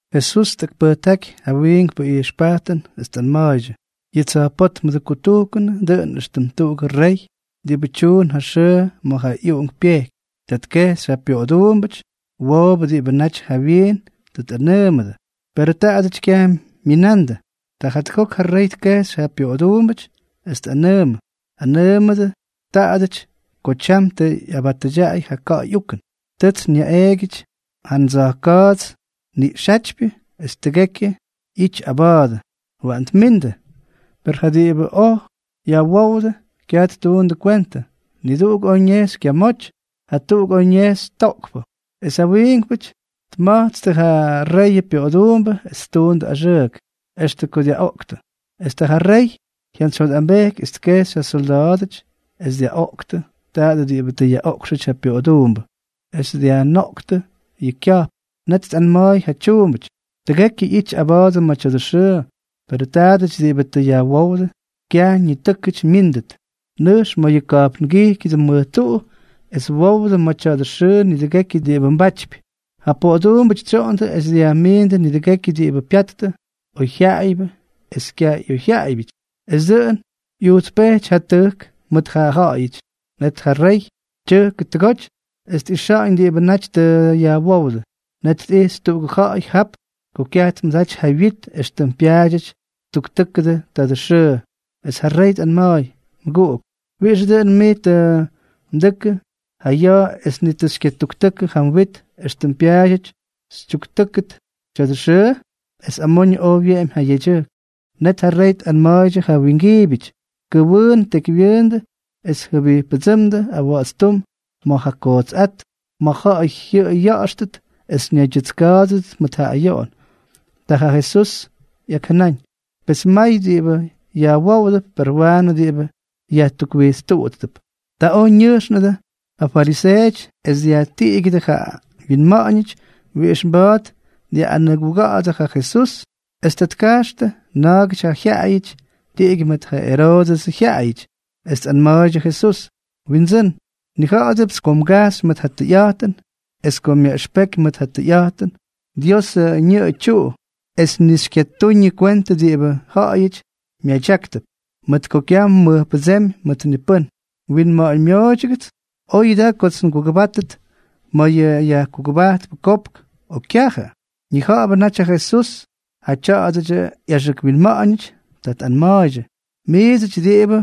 Jesús tꞌakpʉjtáky ja wiinkpʉ ijxpajtʉn, es tꞌanma̱a̱ydyʉ: —Yʉ tsa̱jpótmʉdʉ kutujkʉnʉ dʉꞌʉn éxtʉm tuꞌugʉ rey diꞌibʉ tyuun ja xʉʉ ma̱ ja ꞌyuꞌunk pyejky. Ta tkejxy ja pyoꞌoduumbʉty woobʉ diꞌibʉ naty jawyiin tʉ tꞌanʉʉmʉdʉ, perʉ taadʉty kyaj myinandʉ. Ta jatʉgok ja rey tkejxy ja pyoꞌoduumbʉty, es tꞌanʉʉmʉ: “Anʉʉmʉdʉ taadʉty ko tyam tʉ ꞌyabatʉdyaꞌay ja ka̱ꞌa̱y ukʉn. Tʉts nyaꞌeegyʉty ja ndsa̱jka̱a̱tsʉ niꞌxyátyʉtypyʉ es tʉgekyʉ ꞌyity aba̱a̱dʉ. Waꞌan tmindʉ.” Per ja diꞌibʉ oj yajwówdʉ kyaj ttuundʉ kwentʉ, niduꞌuk oj ñejxy kyamoty, jatuꞌuk oj ñejxy toꞌkpʉ, es ja wiinkpʉty tma̱jtstʉ ja reyʉ pyoꞌoduumbʉ es ttuundʉ axʉʉk, extʉ ko dyaꞌoꞌktʉ. ’Es ta ja rey jyantsyjyotꞌambejky, es tkejxy ja syolda̱a̱dʉty es dyaꞌoꞌktʉ taadʉ diꞌibʉ tʉ yaꞌoꞌkxʉty ja pyoꞌoduumbʉ, es dyajnoꞌktʉ yʉ kya̱jpn. Net tꞌanma̱a̱y ja tyuumbʉty: “Tʉgekyʉ ꞌyity aba̱a̱dʉ ma̱ tya̱dʉ xʉʉ, perʉ taadʉty diꞌibʉ tʉ yajwówdʉ, kyaj ñitʉ́kʉty myíndʉt. Nʉjxtʉ ma̱ yʉ ka̱jpngijkyʉdʉ mʉj tuꞌu, es wowdʉ ma̱ tya̱dʉ xʉʉ nidʉgekyʉ diꞌibʉ mbatypy.” Ja poꞌoduumbʉty tsyoꞌondʉ es dyajmiindʉ nidʉgekyʉ diꞌibʉ pyattʉ, oyjyaꞌaybyʉ esʉ kyaj ꞌyoyjyaꞌaybyʉty; es dʉꞌʉn ꞌyujtspejty ja tʉjk mʉt ja ja̱ꞌa̱yʉty. ’Net ja rey tyʉjkʉ tʉgoty es tꞌixa̱ꞌa̱ñ diꞌibʉ naty tʉ yajwówdʉ. Net tꞌijxy tuꞌugʉ ja̱ꞌa̱y jap ko kyaj tmʉdaty ja wyit éxtʉm pyaadyʉty ttuktʉkʉ tadʉ xʉʉ. Es ja rey tꞌanma̱a̱y: “Mʉguꞌuk, ¿wiꞌixʉ dʉꞌʉn mij tʉ mdʉkʉ ja ya̱a̱ es ni tʉ xykyatuktʉkʉ yʉ mwit éxtʉm pyaadyʉty xytyuktʉkʉ tya̱dʉ xʉʉ?” Es amoñʉ oj wyeꞌemy ja yedyʉjk. Net ja rey tꞌanma̱a̱ydyʉ ja wingiibyʉty: “Kʉwʉʉn tekywyʉʉndʉ es jʉbijppʉdsʉ́mdʉ awa̱ꞌa̱tstúm ma̱ ja kootsꞌát, ma̱ ja̱ꞌa̱y jyʉꞌʉy ya̱ꞌa̱xtʉt es ñaydyʉtska̱a̱dʉdʉt mʉt ja ayoꞌon.” Ta ja Jesús ꞌyakjʉnáñ: —Pes may diꞌibʉ yajwoodʉp, per waanʉ diꞌibʉ yajtukwijtstútp. Ta oj ñʉjxnʉdʉ ja fariseeʉty es dyajtiꞌigyʉdʉ ja wyinma̱ꞌa̱ñʉty wiꞌix mba̱a̱t dyaꞌꞌanʉguga̱ꞌa̱dʉ ja Jesús. Es ta tkajxtʉ na̱a̱gʉty ja jyaꞌayʉty tiꞌigyʉ mʉt ja Eroodʉsʉ jyaꞌayʉty, es tꞌanma̱a̱ydyʉ Jesús: —Windsʉ́n, nnija̱ꞌa̱dʉpts ko mgajxy mʉt ja tʉyꞌa̱jtʉn es ko myaꞌʉxpeky mʉt ja tʉyꞌa̱jtʉnʉ Diosʉ ñʉꞌʉ tyuꞌu, es ni xykyatuñʉ kwentʉ diꞌibʉ ja̱ꞌa̱yʉty myadyáktʉp, mʉt ko kyaj mmʉjpʉdsémy mʉt ni pʉ́n. Winma̱ꞌa̱ñmyooydyʉgʉts. ¿Oyʉ daa kots ngugʉbáttʉt ma̱ yʉ yajkutujkpʉ kopk, o kyajʉ? Ñija̱ꞌa̱bʉ naty ja Jesús ja tya̱a̱dʉdyʉ ꞌyaxʉk winma̱ꞌa̱ñʉty. Ta tꞌanma̱a̱ydyʉ: —Miidsʉty diꞌibʉ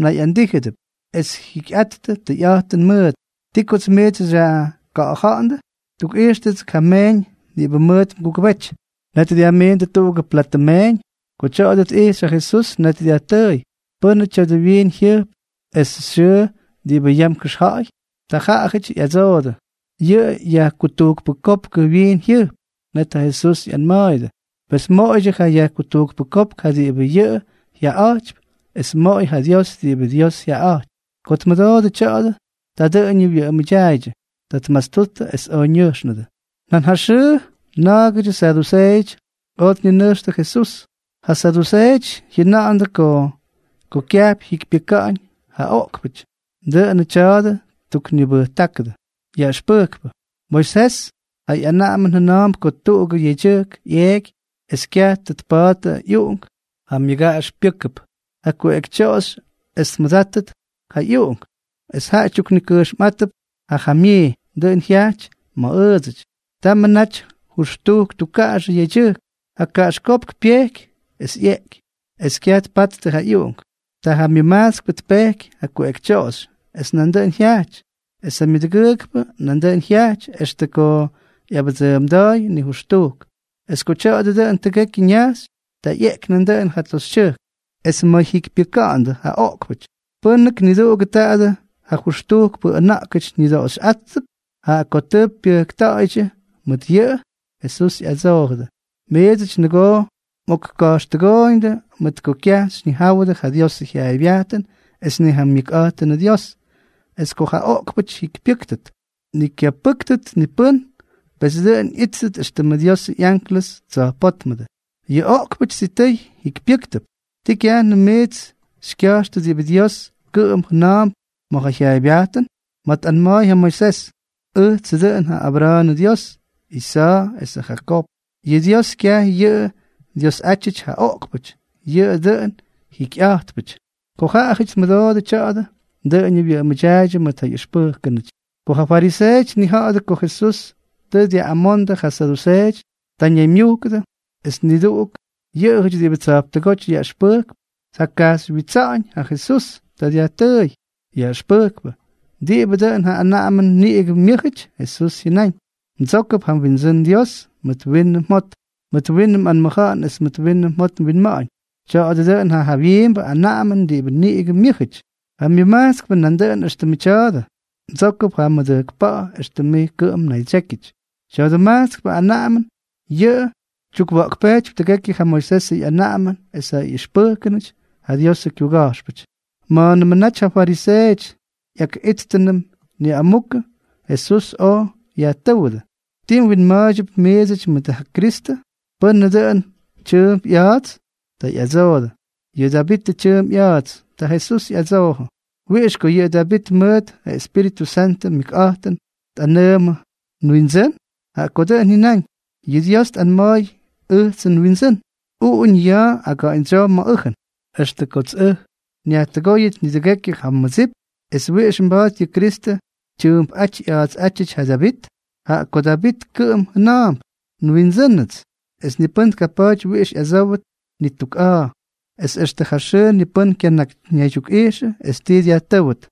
nayꞌandíjʉdʉp es jyikyꞌattʉ tʉyꞌa̱jtʉn mʉʉt, ¿ti kots miits xyajka̱ꞌa̱ja̱ꞌa̱ndʉ? Tukꞌijxtʉgʉts ja meeñ diꞌibʉ mʉʉt mgugʉbety. Net dyajmiindʉ tuꞌugʉ platʉ meeñ. Ko tya̱a̱dʉ tꞌijxy ja Jesús, net dyajtʉʉy: —¿Pʉ́nʉ tya̱a̱dʉ wyiin jyʉjp esʉ xyʉʉ diꞌibʉ yam kʉxja̱ꞌa̱y? Ta jaꞌajʉty ꞌyadsoodʉ: —Yʉ yajkutujkpʉ kopkʉ wyiin jyʉjp. Net ja Jesús ꞌyanma̱a̱yʉdʉ: —Pes moꞌoydyʉ ja yajkutujkpʉ kopk ja diꞌibʉ yʉꞌʉ jyaꞌaꞌa̱jtypy, es moꞌoy ja Dios diꞌibʉ Dios jyaꞌaꞌa̱jtypy. Ko tmʉdoodʉ tya̱a̱dʉ, ta dʉꞌʉñʉ wyʉꞌʉmʉdyaaydyʉ. Ta tmastuttʉ es oj ñʉjxnʉdʉ. Nan ja xʉʉ na̱a̱gʉdyʉ saduseeʉty oj tninʉjxtʉ Jesús. Ja saduseeʉty jyʉna̱ꞌa̱ndʉ ko kyajp jyikypyʉka̱ꞌa̱ñ ja oꞌkpʉty. Dʉꞌʉnʉ tya̱a̱dʉ ttuknibʉjtákʉdʉ: —Yaꞌʉxpʉjkpʉ, Moisés ja ꞌyanaꞌamʉn jʉna̱a̱mp ko tuꞌugʉ yedyʉjk ꞌyeeky es kyaj tʉ tpa̱a̱ttʉ ꞌyuꞌunk, ja myʉgaꞌax pyʉ́kʉp ja kuꞌekytyoꞌoxy es tmʉdáttʉt ja ꞌyuꞌunk, es jaꞌa tyuknikʉjxmꞌátʉp ja jamyii. Dʉꞌʉn jyajty ma̱ ʉʉdsʉty. Tamʉ naty jʉxtujk tukkaꞌaxʉ yedyʉjkʉty. Ja kaꞌaxkópk pyejky, es ꞌyeꞌky, es kyaj tpattʉ ja ꞌyuꞌunk. Ta ja myʉmajtskpʉ tpejky ja kuꞌekytyoꞌoxy. Es nandʉꞌʉn jyajty, es ja myʉdʉgʉʉkpʉ nandʉꞌʉn jyajty, extʉ ko ꞌyabʉdsʉʉmda̱a̱y nijʉxtujk. Es ko tya̱a̱dʉ dʉꞌʉn tʉgekyʉ ñajxy, ta ꞌyeꞌky nandʉꞌʉn ja toxytyʉjk. Es ma̱ jyikypyʉka̱ꞌa̱ndʉ ja oꞌkpʉty, ¿pʉ́nʉk niduꞌugʉ tadʉ jʉxtujkpʉ ʉna̱ꞌkʉty ñʉdoꞌoxyꞌátʉp, jaꞌa ko tʉ pyʉjkta̱ꞌa̱ydyʉ mʉt yʉꞌʉ? Jesús ꞌyadsoojʉdʉ: —Miidsʉty nʉgoo mꞌokka̱jxtʉgooyñʉdʉ mʉt ko kyaj xyñijáwʉdʉ ja Diosʉ jyaaybyajtʉn es ni ja myʉkꞌa̱jtʉnʉ Dios. Es ko ja oꞌkpʉty jyikypyʉ́ktʉt, ni kyapʉ́ktʉt ni pʉ́n, pes dʉꞌʉn ꞌyíttʉt éxtʉmʉ Diosʉ ꞌyánklʉsʉ tsa̱jpótmʉdʉ. Yʉ oꞌkpʉty sitʉy jikypyʉ́ktʉp. ¿Tii kyajnʉm miits xykya̱jxtʉ diꞌibʉ Dios kʉꞌʉm jʉna̱a̱mp ma̱ ja jyaaybyajtʉn?, ma̱ tꞌanma̱a̱y ja Moisés: “Ʉjtsʉ dʉꞌʉn ja Abra̱a̱nʉ Dyios, Isa̱a̱ esʉ Jakoob.” Yʉ Dios kyaj yʉꞌʉ Dyiosꞌátyʉty ja oꞌkpʉty, yʉꞌʉ dʉꞌʉnʉ jiikypyʉty. Ko ja ja̱ꞌa̱yʉty tmʉdoodʉ tya̱a̱dʉ, dʉꞌʉñʉ wyʉꞌʉmʉdyaaydyʉ mʉt ja ꞌyʉxpʉjkʉnʉty. Ko ja fariseeʉty tnija̱ꞌa̱dʉ ko Jesús tʉ dyaꞌꞌamondʉ ja saduseeʉty, ta ñaymyujkʉdʉ, es niduꞌuk yʉꞌʉjʉty diꞌibʉ tsa̱jptʉgóty yaꞌʉxpʉjkp tjakajxywyitsa̱ꞌa̱ñ ja Jesús. Ta dyajtʉʉy: —Yaꞌʉxpʉjkpʉ, ¿diꞌibʉ dʉꞌʉn ja anaꞌamʉn niꞌigʉ myʉ́jʉty? Jesús jyʉnáñ: —“Mdsókʉp ja mWindsʉ́n Dios mʉt winʉ mjot, mʉt winʉ mꞌanmʉja̱ꞌa̱n es mʉt winʉ mjot mwinma̱ꞌa̱ñ.” Tya̱a̱dʉ dʉꞌʉn ja jawyiimbʉ anaꞌamʉn diꞌibʉ niꞌigʉ myʉ́jʉty. Ja myʉmajtskpʉ nandʉꞌʉn éxtʉmʉ tya̱a̱dʉ: “Mdsókʉp ja mmʉdʉjkpa̱ꞌa̱ éxtʉm mij kʉꞌʉm mnaydsyékyʉty.” Tya̱dʉ majtskpʉ anaꞌamʉn yʉꞌʉ tyukwa̱ꞌkpejtypy tʉgekyʉ ja Moisesʉ ꞌyanaꞌamʉn es ja ꞌyʉxpʉjkʉnʉty ja Diosʉ kyuga̱jxpʉty. Ma̱a̱nʉmʉ naty ja fariseeʉty ꞌyakꞌíttʉnʉm niꞌamukʉ, Jesús oj yajtʉ́wʉdʉ: —¿Ti mwinma̱a̱ydyʉp miidsʉty mʉt ja Kristʉ? ¿Pʉ́nʉ dʉꞌʉnʉ tyʉʉmp ꞌya̱a̱ts? Ta ꞌyadsoodʉ: —Yʉꞌʉ Davitʉ tyʉʉmp ꞌya̱a̱ts. Ta Jesús ꞌyadsoojʉ: —¿Wiꞌix ko yʉ Davit mʉt ja Espíritʉ Santʉ myʉkꞌa̱jtʉn tꞌanʉʉmʉ nWindsʉ́n? Jaꞌa ko dʉꞌʉn jyʉnáñ: Yʉ Dios tꞌanma̱a̱y ʉjtsʉ nWindsʉ́n: “Uꞌuñʉ ya̱a̱ aga̱ꞌa̱ñdsyoo ma̱ ʉjʉn, extʉ kots ʉj nyajtʉgóyʉt nidʉgekyʉ ja mmʉdsip.” ¿Es wiꞌix mba̱a̱t yʉ Kristʉ tyʉʉmpꞌáty ꞌya̱a̱tsꞌátyʉty ja Davit?, jaꞌa ko Davit kʉꞌʉm jʉna̱a̱mp “nWindsʉ́nʉts.” Es ni pʉ́n tkapa̱a̱ty wiꞌix ꞌyadsówʉt ni tuk a̱a̱. Es extʉ ja xʉʉ ni pʉ́n kyanakyñaydyukꞌaꞌijxʉ es tii dyajtʉ́wʉt.